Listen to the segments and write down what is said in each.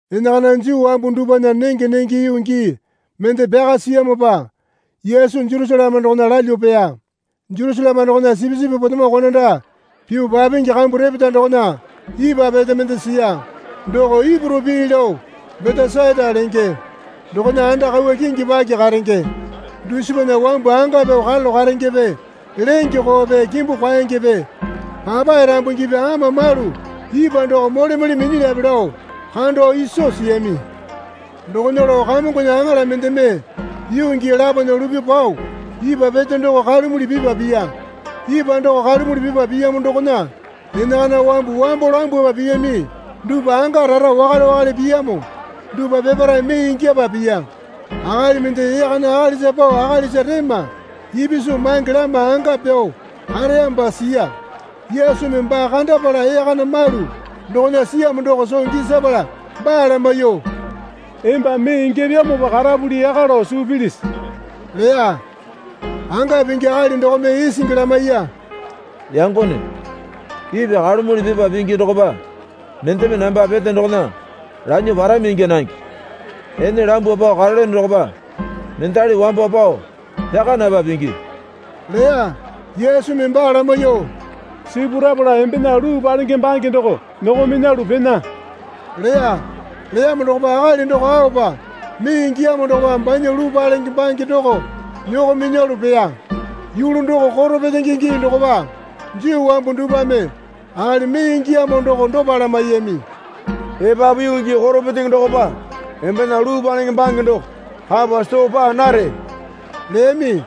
Enakana Juu wambu dupwana nenge nenge yuu gii mende pyaka siyamopa Yesu Jerusaleme dokona lalyuo peya. Jerusaleme dokona sipisipi potemo konanda pyuo papingi kambu repeta dokona ipwa pete mende siya. Doko Ipuru pii lao Betesaita lenge. Dokona anda kauwa kingi paki karenge. Dusipana wambu anga pyao karalu karengepe lenge koope kimbu kwaengepe papae rambungipi ama malu ipwa doko mole mole minyilyape lao kando iso siyami. Dokona lao Kamongona aŋala mendeme yuu gii lapona lupyuo pao ipwa pete doko kalumuli pipa piya. Ipwa doko kalumuli pipa piyamo dokona enakana wambu wambo lambwapa piyami dupwa anga rara wakale wakale piyamo dupwa peparae mee ingyapa piya. Akali mende ee kana akalisa pao akalisa rema ipisu mange lama anga pyao kareyamopa siya. Yesumi baa kandapala ee kana malu dokona siyamo doko soo gisapala baa lamaiyuo, Emba mee ingyapyamopa karapuli yaka lao suu pilisi? leya. Anga pingi akali dokome isingi lamaiya. Yangone, ipwa kalumuli pipa pingi dokopa mendeme namba pete dokona lanyuo parami ingya nange. Ene lambuo pao karelyono dokopa mendali wambo pao pyaka napa pingi leya. Yesumi baa lamaiyuo, Sipurapala embena luu palenge bange doko nyoko minyalu pena, leya. Leyamo dokopa akali doko aopa mee ingiyamo dokopa banya luu palenge bange doko nyoko minyalu peya. Yulu doko koro petenge gii dokopa. Juu wambu dupwame akali mee ingiyamo doko dopa lamaiyami. Epapu yuu koro petenge dokopa embena luu palenge bange doko kapa soo paa nare leyami.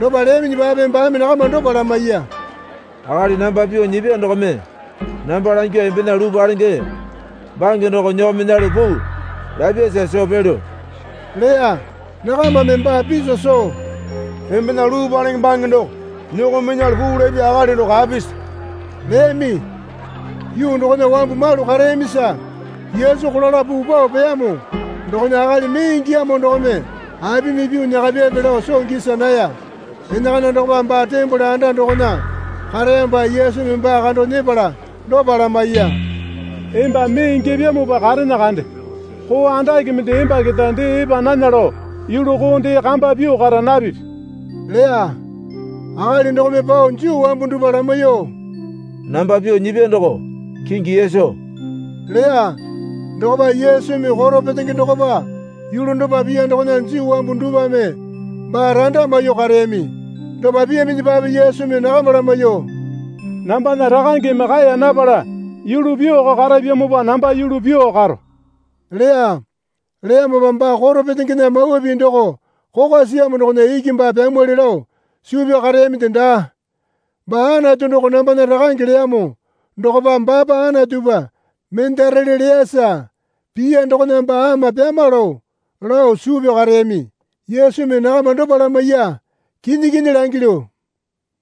Dopa leyaminyipape baame nakama dopa lamaiya. Akali namba pyuo nyipya dokome namba langyuo embena luu palenge bange doko nyoko minyalu puu lapyasa soo pelyo leya. Nakamame baa piso soo, Embena luu palenge bange doko nyoko minyalu puu lapya akali doko apisi? leyami. Yuu dokona wambu malu kareyamisa Yesu kolala puu pao peyamo dokona akali mee ingiyamo dokome apimi pyuo nyakapyape lao soo gisa naya. Enakana dokopa baa tembole anda dokona kareyamopa Yesumi baa kando nyepala dopa lamaiya. Emba mee ingyapyamopa karene kande. Koo andake mende emba keta dee epa nana lao yulu koo dee kamba pyuo kara napipi leya. Akali dokome pao Juu wambu dupwa lamaiyuo, Namba pyuo nyipya doko kingi Yesu, leya. Dokopa Yesumi koro petenge dokopa yulu dopa piya dokona Juu wambu dupwame baa randa maiyuo kareyami. Dopa piyaminyipape Yesumi nakama lamaiyuo, Nambana Rakangeme kaeya napala yulu pyuoko karapyamopa namba yulu pyuo karo leya. Leyamopa baa koro petengena mawa pii doko kokwa siyamo dokona iki baa pyamwali lao suu pyao kareyaminde daa. Baa Anatu doko nambana Rakange leyamo dokopa baapa Anatupa mendarele leyasa piya dokona baa ama pyama lao, lao suu pyao kareyami. Yesumi nakama dopa lamaiya. Kinyi kinyi langilyu,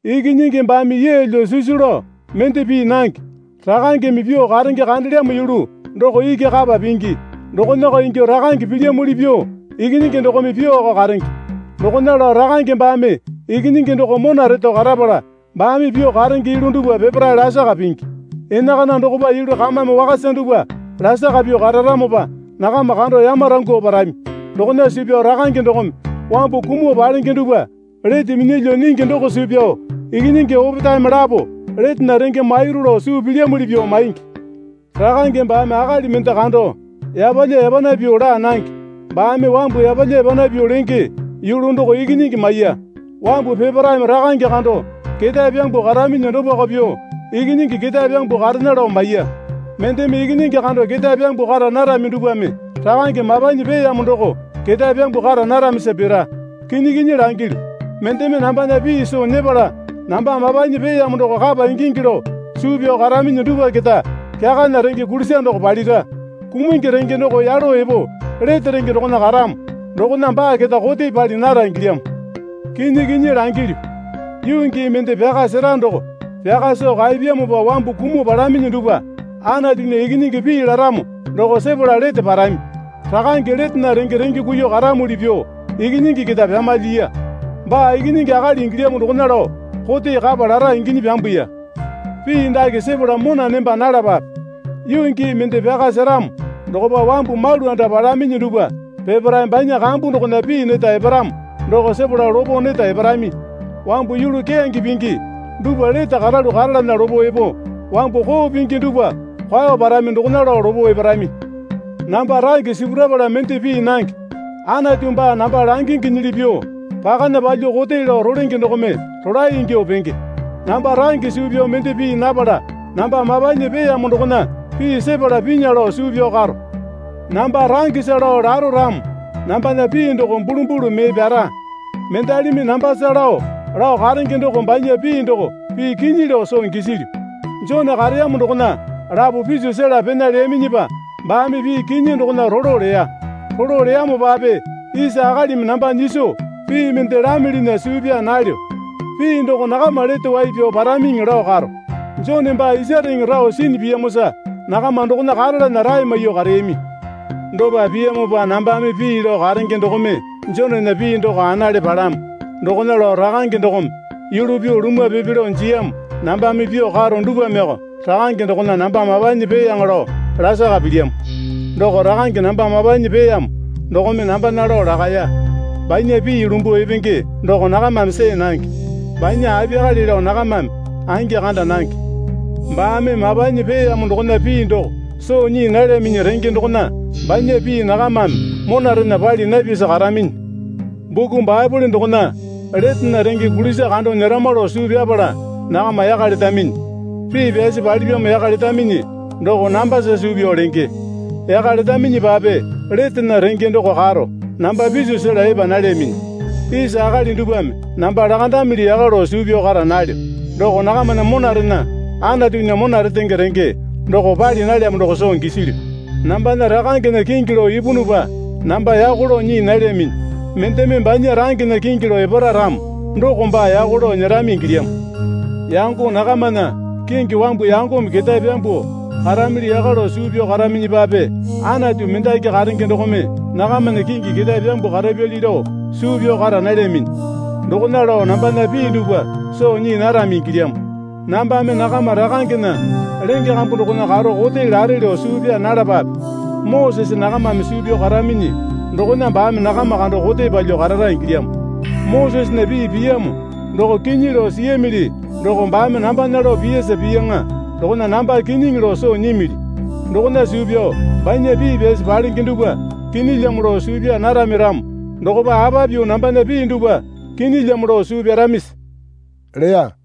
Ikinyingi baame yeelyo sisu lao mende pii nange. Rakangeme pyuo karenge kandelyamo yulu doko iki kapa pingi. Dokonako ingyuo Rakange pilyamuli pyuo Ikinyingi dokome pyuoko karenge. Dokona lao Rakange baame Ikinyingi doko mona reto karapala baame pyuo karenge yulu dupwa peparae lasaka pingi. Enakana dokopa yulu kamame wakasa dupwa lasaka pyuo kararamopa nakama kando yamarangyuo parami. Dokona suu pyao Rakange dokome wambu kumuo palenge dupwa lete minyalyuo nyingi doko suu pyao Ikinyingi opetaeme lapo letena renge mairu lao suu pilyamuli pyuo maingi. Rakange baame akali mende kando yapalya yapana pyuo laa nange. Baame wambu yapalya yapana pyuo lenge yulu doko Ikinyingi maiya. Wambu peparaeme Rakange kando ketae pyambuo karaminyi dopako pyuo Ikinyingi ketae pyambuo karena lao maiya. Mendeme Ikinyingi kando ketae pyambuo kara narami dupwame Rakange mapanyi peeyamo doko ketae pyambuo kara naramisa pira. Kinyi kinyi langilyu, mendeme nambana pii soo nyepala namba mapanyi peeyamo doko kapa ingingi lao suu pyao karaminyi dupwa keta kyakana renge kulisa doko palira. Kumungi renge doko yalo epo lete renge dokona karamo dokona baa keta kote pali nara ingilyamo. Kinyi kinyi langilyu, yuu gii mende pyaka sera doko pyaka soo kaepyamopa wambu kumuo palaminyi dupwa Anatunya Ikinyingi pii laramo doko sepala lete parami. Rakange letena renge renge kuiyuo karamuli pyuo Ikinyingi keta pyamalyiya. Baa Ikinyingi Akali ingilyamo dokona lao kote kapa lara inginyi pyambuya. Pii dake sepala mona nemba nalapape. Yuu gii mende pyaka seramo dokopa wambu malu anda palaminyi dupwa peparae banya kambu dokona pii neta eparamo doko sepala lopo neta eparami. Wambu yulu keyange pingi dupwa lete karalu karalana lopo epo, wambu koo pingi dupwa kwao parami dokona lao lopo eparami. Namba range sipurapala mende pii nange. Anatu baa namba langinginyili pyuo pakana palyuo kote lao rolenge dokome rolae ingyuo penge. Namba range suu pyao mende pii napala namba mapanyi peeyamo dokona pii sepala pinya lao suu pyao karo. Namba rangesa lao laro ramo nambana pii doko bulumbulu mee pyara. Mendalimi nambasa lao lao karenge doko banya pii doko pii kinyi lao soo gisilyu. Jone kareyamo dokona lapo piso sela pena leyaminyipa baame pii kinyi dokona rolo leya. Rolo leyamopape isa akalimi namba nyiso pii mende lamilinya suu pyaa nalyo. Pii doko nakama lete wai pyao paramiŋi lao karo. Jone baa isareŋe rao sinyi piyamosa nakama dokona karalana rae maiyuo kareyami. Dopa piyamopa nambame pii lao karenge dokome Jonena pii doko anale palamo. Dokona lao Rakange dokome yulu pyuo lumwa pipi lao jiyamo nambame pyuo karo dupwameko Rakange dokona namba mapanyi peeyaŋa lao lasaka pilyamo. Doko Rakange namba mapanyi peeyamo dokome nambana lao lakaya. Banya pii lumbuo epenge doko nakamame see nange. Banya apiyakale lao nakamame angi kanda nange. Baame mapanyi peeyamo dokona pii doko soo nyii nalyaminyi renge dokona banya pii nakamame monarena pali napyasa karaminyi. Buku Baepole dokona letena renge kulisa kando nyerama lao suu pyapala nakama yaka letaminyi. Pii pyasi palipyamo yaka letaminyi doko nambasa suu pyao lenge. Yaka letaminyipape letena renge doko karo namba piso sela epa nalyaminyi. Isa akali dupwame namba lakandamili yaka lao suu pyao kara nalyo. Doko nakamana monarena Anatunya mona retenge renge doko pali nalyamo doko soo gisilyu. Nambana Rakangena kingi lao ipunupa namba yako lao nyii nalyaminyi. Mendeme banya rangena kingi lao epara ramo doko baa yako lao nyerami ingilyamo. Yango nakamana kingi wambu yangome ketae pyambuo karamili yaka lao suu pyao karaminyipape Anatu mendaki karenge dokome nakamana kingi ketae pyambuo karapyali lao suu pyao kara nalyaminyi. Dokona lao nambana pii dupwa soo nyii narami ingilyamo. Nambame nakama rakangena lenge kambu dokona karo kote lare lao suu pyaa nalapape. Mosese nakamame suu pyao karaminyi dokona baame nakama kando kote palyuo karara ingilyamo. Mosesena pii piyamo doko kinyi lao siyamili doko baame nambana lao piyara piyaŋa dokona namba kinyiŋi lao soo nyimili. Dokona suu pyao banya pii pyasi palenge dupwa kinyilyamo lao suu pyaa narami ramo dokopa apa pyuo nambana pii dupwa kinyilyamo lao suu pyaramisi? leya.